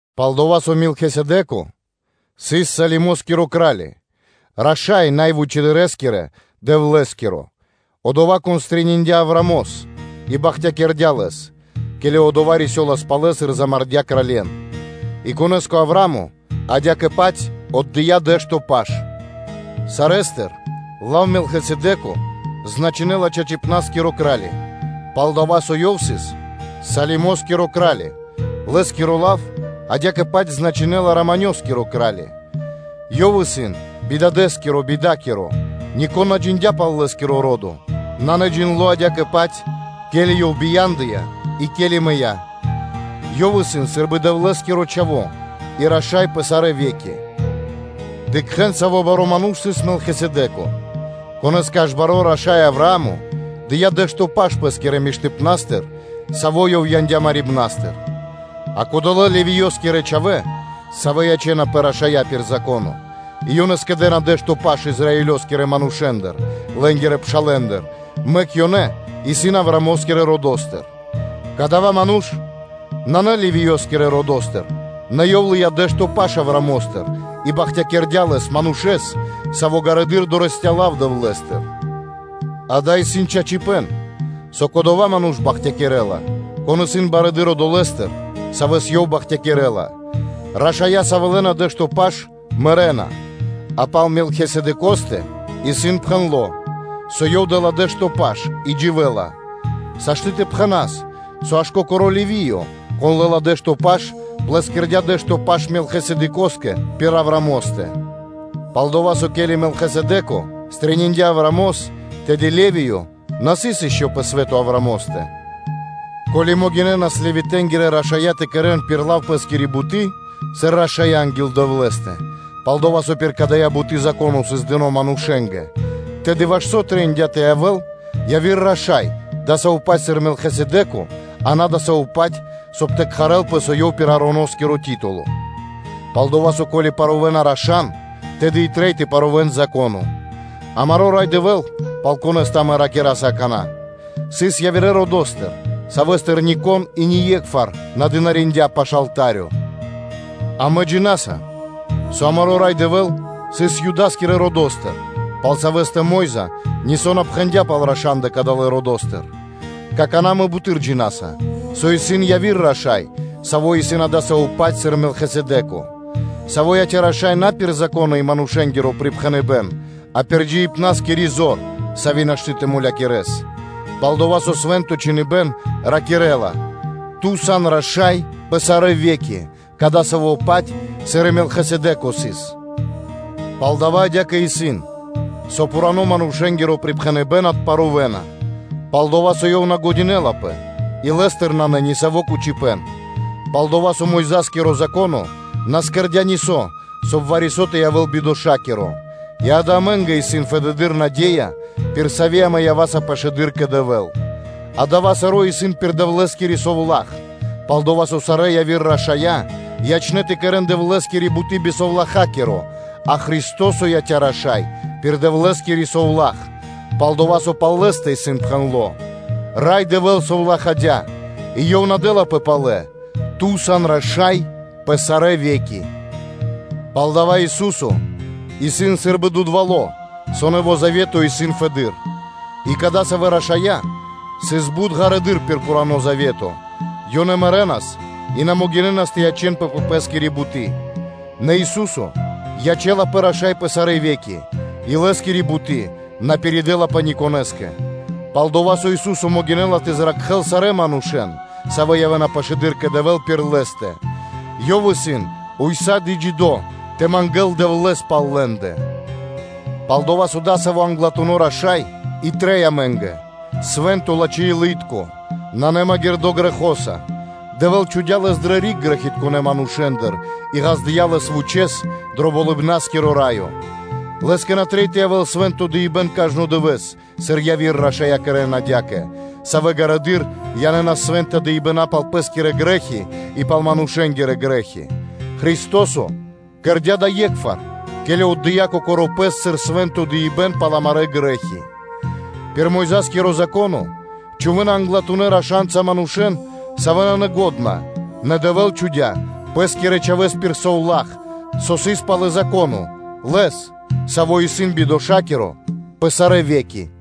Пал-дова́ со Мелхисэдэ́ко сыс Салимоскиро кра́ли, раша́й Най Вучэдырэскирэ Дэвлэ́скиро, одова́, кон стрэниндя (пирилыя) Авраамос и бахтякирдя́ лэс, ке́ли одова́ рисёлас палэ, сыр мулякирдя́ кралье́н; и конэ́скэ Авраа́мо адя́кэ-паць отдыя́ дэ́што паш сарэ́стыр, пал-дова́ со лав Мелхисэдэко значынэ́ла “чачипна́скиро Кра́ли”, и пал-дова́ со ёв сыс Салимоскиро кра́ли, лэ́скиро лав адя́кэ-паць значынэ́ла “Раманёскиро (Мироскиро) Кра́ли”; ёв сыс бидадэскиро, бидакиро, нико́н на джиндя́ пал лэ́скиро ро́до; дава́ исын наджиндло адя́кэ-паць, ке́ли ёв бия́ндыя и ке́ли мыя́, Ёв исын сы́рбы Дэвлэ́скиро Чхаво́ и раша́й пэ сарэ́ ве́ки. Дыкхэ́н, саво́ баро́ ману́ш сыс Мелхисэдэко, конэ́скэ аж баро́ раша́й Авраа́мо дыя́ дэ́што паш пэ́скирэ миштыпна́стыр, саво́ ёв яндя́ марибнастыр. А кодолэ́ Левиёскирэ чхавэ́, савэ́ ячэ́напэ рашанца пир Зако́но, и ёнэ скэдэ́на дэ́што паш Израилёскирэ манушэ́ндыр, лэ́нгирэ пшалэ́ндыр; мэк ёнэ исын Авраамо́скирэ родо́стыр. Кадава́ ману́ш нанэ Левиёскирэ родо́стыр, нэ ёв лыя́ дэ́што паш Авраамостыр и бахтякирдя́ лэс, манушэ́с, саво́ ґарэдыр дорэсця́ лав Дэвлэ́стыр. Дава́ исын чачипэ́н, со кодова́ ману́ш бахтякирэ́ла, кон исын барэды́р одолэ́стыр, савэ́с ёв бахтякирэ́ла. Рашая́, савэ́ лэ́на дэ́што паш, мэрэ́на, а пал Мелхисэдэкостэ исын пхэндло́, со ёв лэ́ла дэ́што паш, и дживэ́ла. Сашты́ (можна) тэ пхэнас, со аж кокоро́ Левиё, кон лэ́ла дэ́што паш, плэскирдя дэ́што паш Мелхисэдэкостэ пир Авраамостэ. Пал-дова́ со, ке́ли Мелхисэдэко стрэниндя (пирилыя) Авраамос, тэды Левиё на сыс ишчо (инкэ́) пэ свэ́то Авраамостэ. Ко́ли могинэ́нас Левитэ́нгирэ рашая́ тэ кэрэ́н кэ ко́нцо (кэ яго́ро) пэ́скири буты́, сыр рашая́ анги́л Дэвлэ́стэ, пал-дова́ со пир дая́ буты́ Зако́но сыс дыно́ манушэ́нгэ, тэды ваш со трэиндя́ тэ явэ́л яви́р Раша́й дасаво-паць сыр Мелхисэдэко, а на дасаво-паць, соб (кай) тэ кхарэлпэ, со ёв пир Ароноскиро рашаипэн (титуло). Пал-дова́ со, ко́ли парувэна раша́н, тэды трэй и тэ парувэн Зако́но. Амаро́ Рай Дэвэ́л, пал Конэ́стэ амэ ракираса какана́, сыс явирэ родо́стыр, савэ́стыр нико́н и ние́кхвар на дынариндя́ пашы́л алта́рё. Амэ джина́са, со амаро́ Рай Дэвэ́л сыс Юда́скирэ родо́стыр, пал Савэ́стэ Мо́йза (Моисеё) нисо́ на пхэндя́ пал рашандэ кадалэ́ родо́стыр. Какана́ амэ буты́р джина́са, со исын яви́р раша́й, саво́ исын адасаво́-паць сыр Мелхисэдэ́ко, Саво́ яця́ раша́са на пир манушэ́нгиро упхэныбэн, сыр дада́, а пир джиибна́скири зор, сави́ нашты́ тэ мулякирэс. Пал-дова́ со Свэ́нто Чхиныбэ́н ракирэ́ла: “Ту сан Раша́й пэ сарэ́ ве́ки, кадасаво́-паць, сыр и Мелхисэдэко сыс.” Палдава́ адя́кэ исын, со пхуранэ́-манушэ́нгиро припхэныбэ́н отпарувэна, пал-дова́ со ёв исын на́лачхо и лэ́стыр нанэ нисаво́ кучипэ́н. Пал-дова́ со Мойза́скиро Законо на кэрдя́ нисо́, соб (кай) вари-со тэ явэ́л бидошакиро; и, ґа́да, амэ́ндэ исын фэдэды́р наде́я, пир сави́ амэ ява́са пашылэды́р кэ Дэвэ́л. Адава́ саро́ исын пир Дэвлэ́скири совла́х, пал-дова́ со сарэ́ яви́р рашая́ ячнэ́ тэ кэрэ́н Дэвлэ́скири буты́ би совлахакиро, а Христо́со яця́ Раша́са (яця́ Раша́й) пир Дэвлэ́скири совла́х, пал-дова́ со пал Лэ́стэ исын пхэндло́: “Рай Дэвэ́л совлахадя́, и Ёв на дэ́лапэ палэ: “Ту сан раша́й пэ сарэ́ ве́ки””, палдава́ Ису́со исын сы́рбы дудвало́ (поручытелё), со нэво́ завето исын фэды́р. И кадасавэ́ рашая́ сыс бут ґарэдыр пир пхурано́ завето, ёнэ мэрэнас и ёнэ на могинэ́нас тэ ячэ́нпэ пэ пэ́скири буты́. Нэ Ису́со ячэ́лапэ Раша́са пэ сарэ́ ве́ки, и Лэ́скири буты́ на пиридэлапэ ни конэ́скэ. Палдава́ Ису́со могинэ́ла тэ зракхэ́л сарэ́ манушэ́н, савэ́ явэ́на пашылэды́р кэ Дэвэ́л пир Лэ́стэ; Ёв исын ўса́ды (сак) джидо́ тэ мангэ́л Дэвлэ́с пал лэ́ндэ. Пал-дова́ со адасаво́ Англатуно́ Раша́й и трэй амэ́нгэ: свэ́нто, лачхэ́-илы́тко, на магирдо́ грэхоса; Дэвэ́л чхудя́ Лэс дрэ риг грэхитконэ́ манушэ́ндыр и ґаздыя́ Лэс вучэ́с дро Болыбна́скиро Раё. Лэ́скэ на трэй тэ янэл свэ́нто дыибэ́н кажно дывэ́с, сыр яви́р рашая́ кэрэ́на адя́кэ, савэ́ ґарэдыр янэ́нас свэ́нта дыибэна́ пал пэ́скирэ грэ́хи, и палэ пал манушэ́нгирэ грэ́хи. Христо́со кэрдя́ дава́ е́кхвар, ке́ли отдыя́ Кокоро́ Пэс сыр свэ́нто дыибэ́н пал амарэ́ грэ́хи. Пир Мойза́скиро Зако́но чхувэ́на англатунэ́ рашанца манушэ́н, савэ́ исын грэхи́тка; нэ Дэвэ́л чхудя́ Пэ́скирэ Чхавэ́с пир совла́х, со сыс пало́ (после) Зако́но, Лэс, Саво́ исын бидошакиро пэ сарэ́ ве́ки.